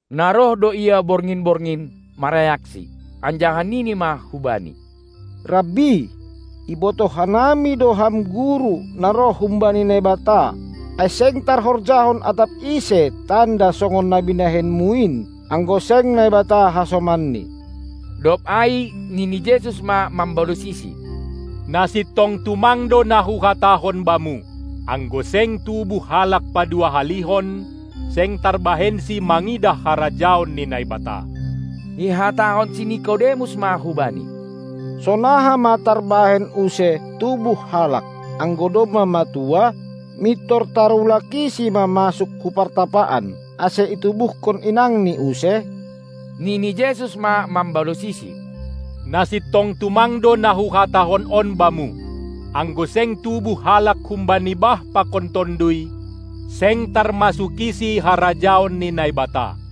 Na roh do ia borngin-borngin marayakSi, anjaha nini ma hu Bani: Rabbi, ibotoh hanami do Ham guru na roh humbani Naibata, ai seng tarhorjahon atap ise tanda songon na binahenMu in, anggo seng Naibata hasomanni. Dob ai nini Jesus ma mambalosisi: Na sintong tumang do na Huhatahon bamu: Anggo seng tubuh halak paduahalihon, seng tarbahensi mangidah harajaon ni Naibata! Ihatahon si Nikodemus ma hubani: Sonaha ma tarbahen use tubuh halak, anggo domma matua? Mintor tarulakisi ma masuk hu partapaan, ase itubuhkon inangni use! Nini Jesus ma mambalosisi: Na sintong tumang do na huhatahon on bamu: Anggo seng tubuh halak humbani bah pakon Tonduy, seng tarmasukisi harajaon ni Naibata.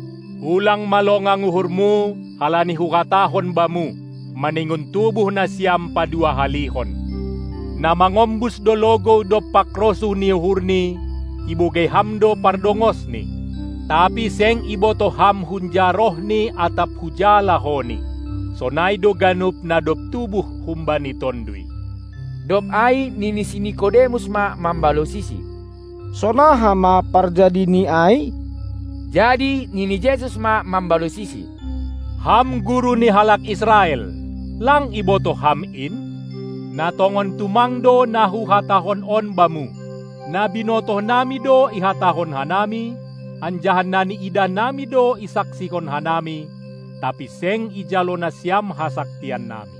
Ulang ma longang uhurmu, halani Huhatahon bamu: Maningon tubuh nasiam padua-halihon. Na mangombus do logou dompak rosuh ni uhurni, ibogei ham do pardongosni, tapi seng ibotoh ham hunja rohni atap huja lahoni. Sonai do ganup na dob tubuh humbani Tonduy. Dob ai nini si Nikodemus ma mambalosiSi: Sonaha ma parjadini ai? Jadi nini Jesus ma mambalosisi: Ham guru ni halak Israel, lang ibotoh ham in? Na tongon tumang do na Huhatahon on bamu: Na binotohnami do ihatahon hanami, anjaha na niidah nami do isaksihon hanami, tapi seng ijalo nasiam hasaksian nami.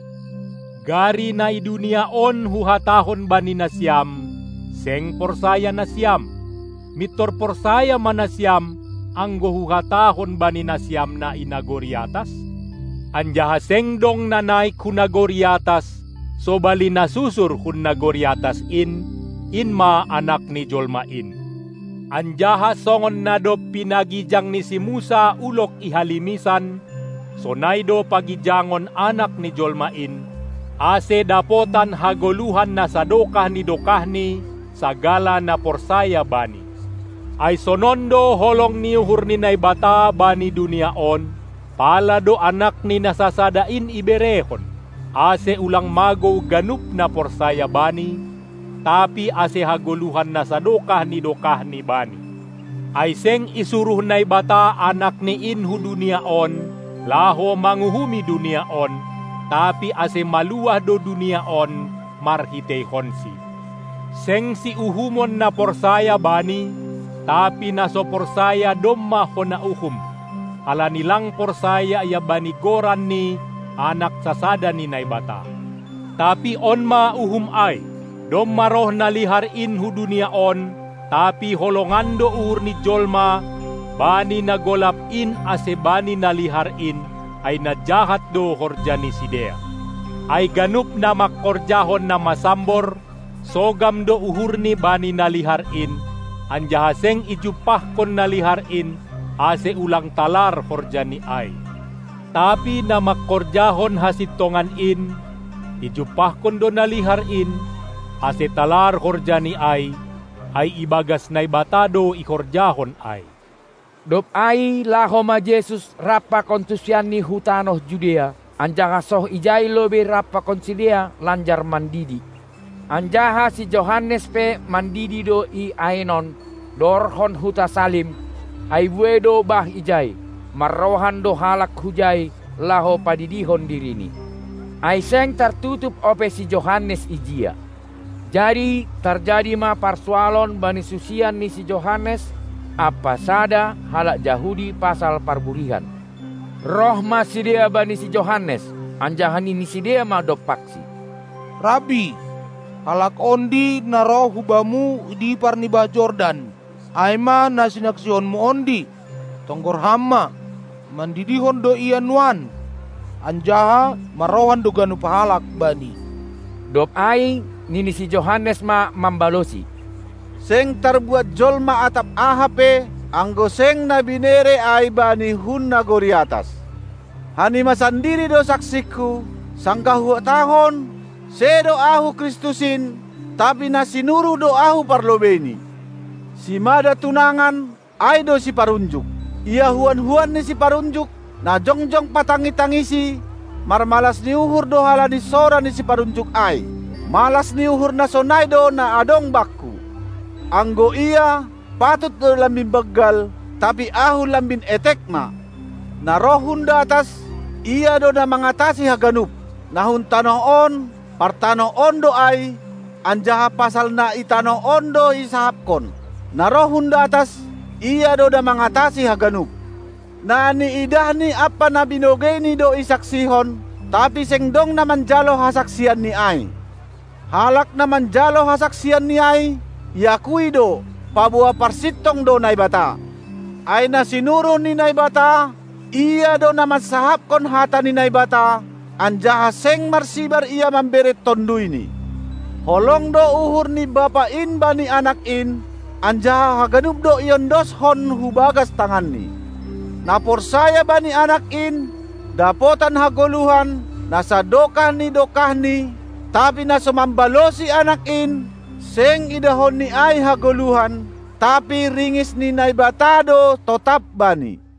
Gari na i dunia on Huhatahon bani nasiam, seng porsaya nasiam, mintor porsaya ma nasiam, anggo Huhatahon bani nasiam na i nagori atas? Anjaha seng dong na naik hu nagori atas, sobali na susur hun nagori atas in, in ma Anak ni jolma in. Anjaha songon na dob pinagijang ni si Musa ulog i halimisan, sonai do pagijangon Anak ni jolma in, ase dapotan hagoluhan na sadokah ni dokahni sagala na porsaya Bani. Ai sonon do holong ni uhur ni Naibata bani dunia on, pala do Anakni na sasada in iberehon, ase ulang magou ganup na porsaya Bani, tapi ase hagoluhan na sadokah ni dokahni bani. Ai seng isuruh Naibata AnakNi in hu dunia on, laho manguhumi dunia on, tapi ase maluah do dunia on marhiteihonSi. Seng siuhumon na porsaya Bani, tapi na so porsaya domma hona uhum, halani lang porsaya ia bani Goran ni Anak sasada ni Naibata. Tapi on ma uhum ai: Domma roh na lihar in hu dunia on, tapi holongan do uhur ni jolma bani na golap in ase bani na lihar in, ai na jahat do horja ni sidea. Ai ganup na mangkorjahon na masambor, sogam do uhurni bani na lihar in, anjaha seng ijumpahkon na lihar in, ase ulang talar horjani ai. Tapi na mangkorjahon hasintongan in, ijumpahkon do na lihar in, ase talar horjani ai, ai ibagas Naibata do ihorjahon ai. Dob ai laho ma Jesus rap pakon susianNi hu tanoh Judea, anjaha soh ijai lobei rap pakon sidea lanjar mandidi. Anjaha si Johannes pe mandidi do i Aenon, dohorhon huta Salim, ai buei do bah ijai. Marrohan do halak hujai, laho padidihon dirini. Ai seng tartutup ope si Johannes ijia. Jadi tarjadi ma parsualon bani susian ni si Johannes ampa sada halak Jahudi pasal parburihan. Roh ma sidea bani si Johannes, anjaha nini sidea ma dompaksi: Rabbi, halak ondi, na roh hubamu i dipar ni bah Jordan, ai ma na sinaksihonmu ondi, tonggor ham ma, mandidihon do Ia nuan, anjaha marrohan do ganup halak Bani. Dob ai nini si Johannes ma mambalosi: Seng tarbuat jolma atap aha pe, anggo seng na binere ai bani hun nagori atas. Hanima sandiri do saksikku, sanggah huhatahon: Sedo ahu Kristus in, tapi na sinuruh do ahu parlobeini. Simada tunangan, ai do siparunjuk. Ia huan-huan ni siparunjuk, na jongjong patangi-tangisi, marmalas ni uhur do halani sora ni siparunjuk ai. Malas ni uhur na sonai do na adong bakku. Anggo Ia, patut do lambin banggal, tapi ahu lambin etek ma. Na roh hun datas, Ia do na mangatasi haganup. Na hun tanoh on, partanoh on do ai, anjaha pasal na i tanoh on do isahapkon; na roh hun datas, Ia do na mangatasi haganup. Na niidahNi ampa na binogeiNi do isaksihon, tapi seng dong na manjalo hasaksianNi ai. Halak na manjalo hasaksianNi ai, iakui do, paboa parsintong do Naibata. Ai na sinuruh ni Naibata, Ia do na mansahapkon hata ni Naibata, anjaha seng marsibar Ia mambere TonduyNi. Holong do uhur ni Bapa in bani Anak in, anjaha haganup do iondoskon hubagas tanganNi. Na porsaya bani Anak in, dapotan hagoluhan na sadokah ni dokahni, tapi na so mambalosi Anak in, seng idahonni ai hagoluhan, tapi ringis ni Naibata do totap bani.